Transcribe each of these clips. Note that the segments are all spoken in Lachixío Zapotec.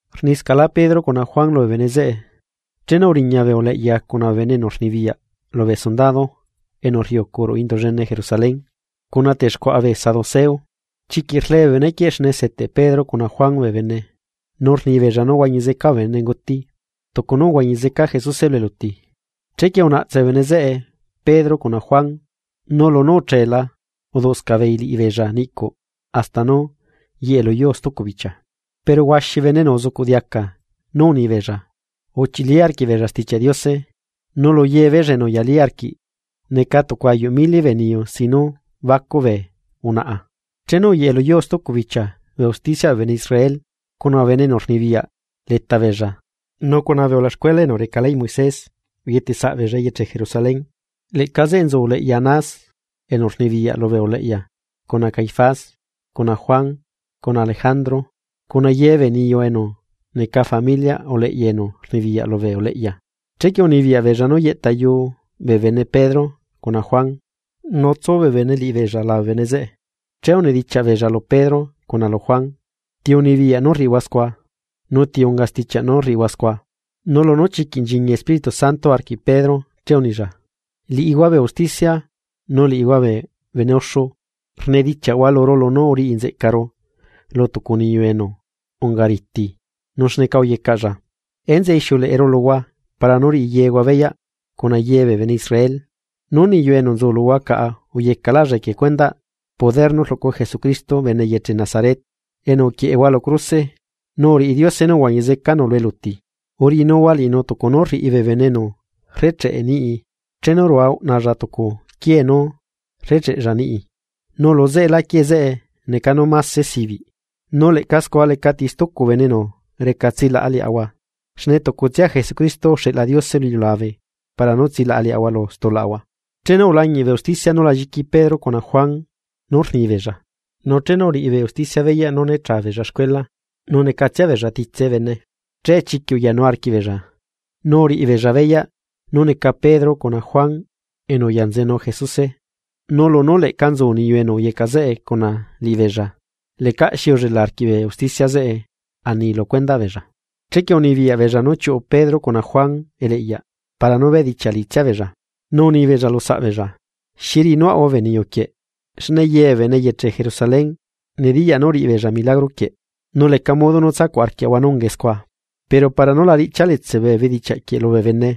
Rniscaꞌlá Pedro cuna Juan lubee bene zeꞌe, chenu uriña bee uleꞌya cuna bee bene enu rnibiyaꞌ lubee sundado enu rriucu ruꞌu Indu llene Jerusalén, cuna texcuaꞌa bee saduceo. Chiquiꞌ rle bee bene quieꞌ xne seteꞌ Pedro cuna Juan bee bene nu rnibeella nú huañi zeca bee benenguti tucu nú uhuañi zeca Jesuse lu eluti. Chequie unaꞌtse bee bene zeꞌe Pedro cuna Juan, nu lunú ucheela uduꞌscaꞌ beei liꞌibeella niꞌcuꞌ hasta nú yeꞌe luyuu stucu bichia. Pero huaxi bene enu uzucuꞌ diaca nú unibeella, uchili arquiꞌbeella Stichiaꞌ Diose nu lu yebeella enu uyalí arquiꞌ neca tucu ayuꞌ mili bee niyu sin nú bacuꞌ bee unaꞌa. Chenu uyeꞌe lu yuu stucu bichia bee usticiaꞌ bee bene Israel cuna bee bene enu rnibiyaꞌ leta beella nu cuna bee ulaxcuela enu reca leyꞌ Moisés uyetesaꞌbeella eyeche Jerusalén. Leꞌca zeꞌe nzu uleꞌya Anás, enu rnibiyaꞌ lubee uleꞌya cuna Caifás cuna Juan cuna Alejandro cuna ye bee niyu enu neca familiaꞌ uleꞌya enu rnibiyaꞌ lubee uleꞌya. Chequie unibiyaꞌ beella nú yeꞌtayu bee bene Pedro cuna Juan, nu tsu bee bene liꞌibeella labe bee bene zeꞌe, che unidichiaꞌ beella lu Pedro cuna lu Juan: ―¿Ti unibiyaꞌ nú rriꞌihua scua? ¿Nu ti unga stichiaꞌ nú rriꞌihua nucuaꞌ? Nu lunú chiquiꞌ nchiñi Espíritu Santo arquiꞌ Pedro che unilla: ―Liꞌihua bee usticia, nu liꞌihua bee bene uxu, rnedichiaꞌhua luru lunú uriꞌinzeꞌcaru lu tucu niyu enu ungariti, nu xneca uyecaꞌlla. Enzeꞌe ixiuleꞌeru luhua para nú riꞌi yehua beyaꞌ cuna ye bee bene Israel nú niyu enu nzu luhua caꞌa uyecaꞌlaꞌlla equie cuendaꞌ poderꞌ Jesucristo bene eyeche Nazaret, enu uquieꞌehua lu cruse nu uriꞌi Diose nú uhuañi zecanu lu eluti. Uriꞌinuhua liꞌinu tucu nú rriꞌi bee bene enu rrecheꞌe niꞌi chenu rua uꞌnalla tucu quié nú recheꞌlla niꞌi, nu lu zeꞌela quie zeꞌe neca nú máse sibiꞌ. Nu leꞌca scua lecati stucu bene enu reca tsilaꞌa liaꞌahua, xne tucutsia Jesucristo uxeꞌla Diose lu iliulabe para nú tsilaꞌa liaꞌahua lu stulaꞌahua. Chenu ulañiꞌ bee usticia nú la lliqui Pedro cuna Juan nú rnibeella, nu chenu uriꞌi bee usticia beyaꞌ nú né cha beella xcuela nu necatsia beella titse bee bene, che chiquiꞌ uyanu arquiꞌbeella. Nu uriꞌibeella beyaꞌ nú neca Pedro cuna Juan enu uyanzenu Jesuse. Nu lunú leꞌca nzu niyu enu uyecaꞌ zeꞌe cuna liꞌibeella lecaꞌxi ullela arquiꞌ bee usticia zeꞌe ani lu cuendaꞌ beella. Chequie unibiyaꞌ beella nú chiuꞌu Pedro cuna Juan eleꞌyaꞌ para nú bedichiaꞌ liꞌitsia beella. Nu unibeella lu saꞌbeella: ―¿Xi riꞌinuaꞌahua bee niyu quieꞌ? Xne ye bee bene eyeche Jerusalén nediyaꞌ nú uriꞌibeella milagro quieꞌ, nu leca modo nú tsacuꞌarquiaꞌahua nú ungae scua. Pero para nú la riꞌchia letselá bee bedichiaꞌ quieꞌ lubee bene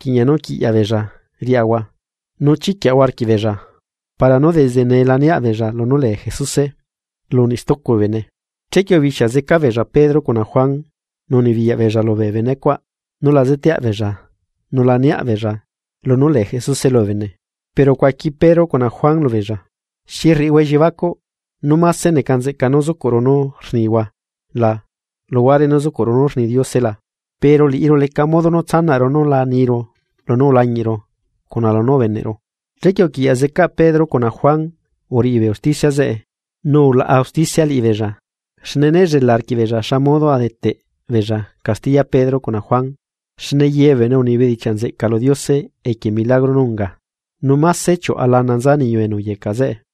rquiꞌña nú quiꞌyaꞌ beella riaꞌahua nu chiquiaꞌahua arquiꞌbeella para nú desde nee la niaꞌbeella lunú lee Jesuse lu niꞌ stucu bee bene. Chequie ubixia zeca beella Pedro cuna Juan nu unibiyaꞌ beella lubee benecuaꞌ nú la zeteaꞌ beella nu la niaꞌ beella lunú lee Jesuse lubee bene. Pero ucuaqui Pedro cuna Juan lubeella: ―¿Xi rriꞌihua elliebacuꞌ nú máse neca nzeꞌca nú zucuꞌru nú rnihua la, luhuare nú zucuꞌru nú rni Diose la? Pero liꞌiru leca modo nú tsanaꞌru nú la niru lunú ulañiꞌru cuna lunú ubeneꞌru. Chequie uquiꞌyaꞌ zeca Pedro cuna Juan uriꞌi bee usticia zeꞌe, nu ulaꞌa usticia liꞌibeella xne né llela arquiꞌbeella xamodo a deteꞌbeella castiya Pedro cuna Juan xne ye bee bene uni bedichiaꞌ nzeꞌca lu Diose equie milagro nú unga. Nu máse chiuꞌa lana nza niyu enu uyecaꞌ zeꞌe.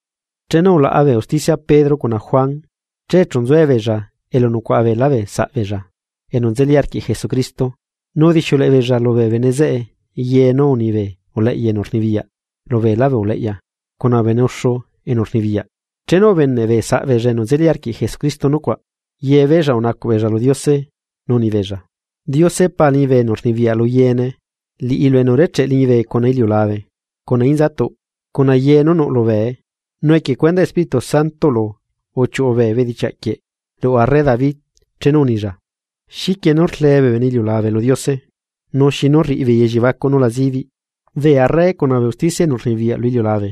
Chenu ulaꞌa bee usticia Pedro cuna Juan, che chu nzuebeella elu nucuaꞌa beelá bee saꞌbeella enu nzeli arquiꞌ Jesucristo. Nu udixiuleꞌe beella lubee bene zeꞌe ye nú uni bee uleꞌya enu rnibiyaꞌ lubeelá bee uleꞌya cuna bee bene uxu enu rnibiyaꞌ. Chenu ubeneꞌ bee saꞌbeella enu nzeli arquiꞌ Jesucristo nucuaꞌ, yebeella unacuꞌ beella lu Diose nu unibeella: ―Diose Pa liñibe enu rnibiyaꞌ lu yeene, liꞌilu enu urecheꞌ liñibe cuna iliulabe, cuna inzatuꞌ, cuna ye nú nuꞌ lubee. Nu equie cuendaꞌ Espíritu Santoꞌlu uchiuꞌu bee bedichiaꞌ quieꞌ ruꞌu arre David chenu unilla: ¿Xiquie nú rlee bee bene iliulabe lu Diose? Nu, ¿xinu rriꞌibeei elliebacuꞌ nú la zibiꞌ? Bee arre cuna bee usticia enu rnibiyaꞌ lu iliulabe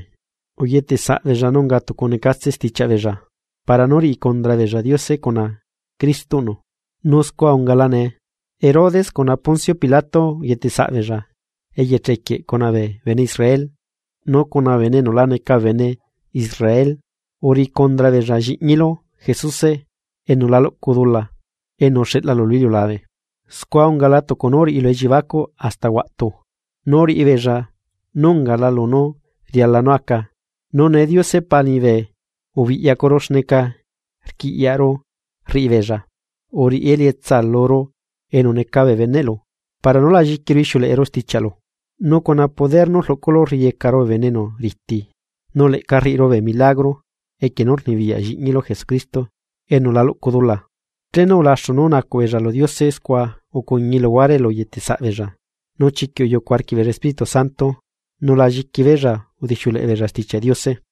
uyetesaꞌbeella, nu unga tucu necatse stichiaꞌ beella, para nú riꞌi cundra beella Diose cuna Cristoꞌnu. ’Nu scua ungala nee, Herodes cuna Poncio Pilato uyete saꞌbeella eyeche quieꞌ cuna bee bene Israel nu cuna bee bene enu la neca bene Israel. Uriꞌi cundra beella lliꞌñilu Jesuse enu la luꞌcu dula enu uxeꞌlalu lu iliulabe. Scua ungala tucu nú uriꞌilu elliebacuꞌ hasta huaꞌtu, nu uriꞌibeella nú ungala lunú riala nú aca. Nu nee, Diose Pa liñibe ubiꞌyacuru xneca rquiꞌyaꞌru rriꞌibeella, uriꞌi elietsa luru enu neca bee beneꞌlu para nú la lliquiru ixiuleꞌeru stichiaꞌlu, nu cuna poder nú rluꞌculu rriyecaru bee bene enu riti, nu leꞌca rriꞌiru bee milagro equie poder nú rluꞌcu lliꞌñilu Jesucristo enu la luꞌcu dula. Chenu ulaxu nú unacuꞌ beella lu Diose ucuñi luhuare elu neyetesaꞌbeella, nu chiquiꞌ uyucu arquiꞌbeella Espíritu Santo nu lá lliqui beella udixiuleꞌe beella Stichiaꞌ Diose.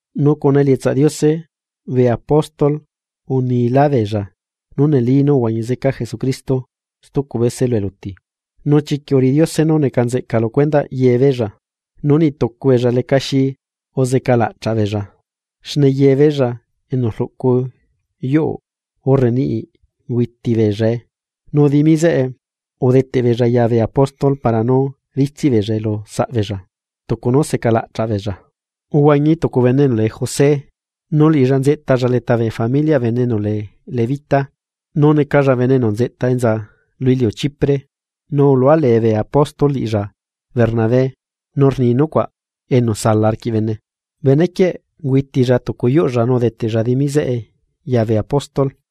Nu cuna elietsaꞌ Diose, bee apóstol unilá beella nú neli nú uhuañi zeca Jesucristo stucu bese lu eluti, nu chiquiꞌ uriꞌi Diose nú neca nzeꞌca lu cuendaꞌ yebeella. Nu niꞌ tucu beella lecaxi uzeca laꞌchaꞌ beella xne ye beella enu rluꞌcu yuu urre niꞌi ungüiti beellae. Nu dimi zeꞌe udeteꞌbeella ya bee apóstol para nú ritsiꞌbeellae lu saꞌbeella tucu nú secalaꞌchaꞌ beella. Uhuañi tucu bene enu lee José, nu liꞌilla nzeꞌtalla leta familiꞌ bene enu lee levita, nu necalla bene enu nzeꞌta enza lu iliu Chipre. Nu uhualee bee apóstol liꞌilla Bernabé, nu rni nucuaꞌ enu sala arquiꞌ bene. Bene quieꞌ ungüitilla tucu yuꞌlla nu udeteꞌlla dimi zeꞌe ya bee apóstol.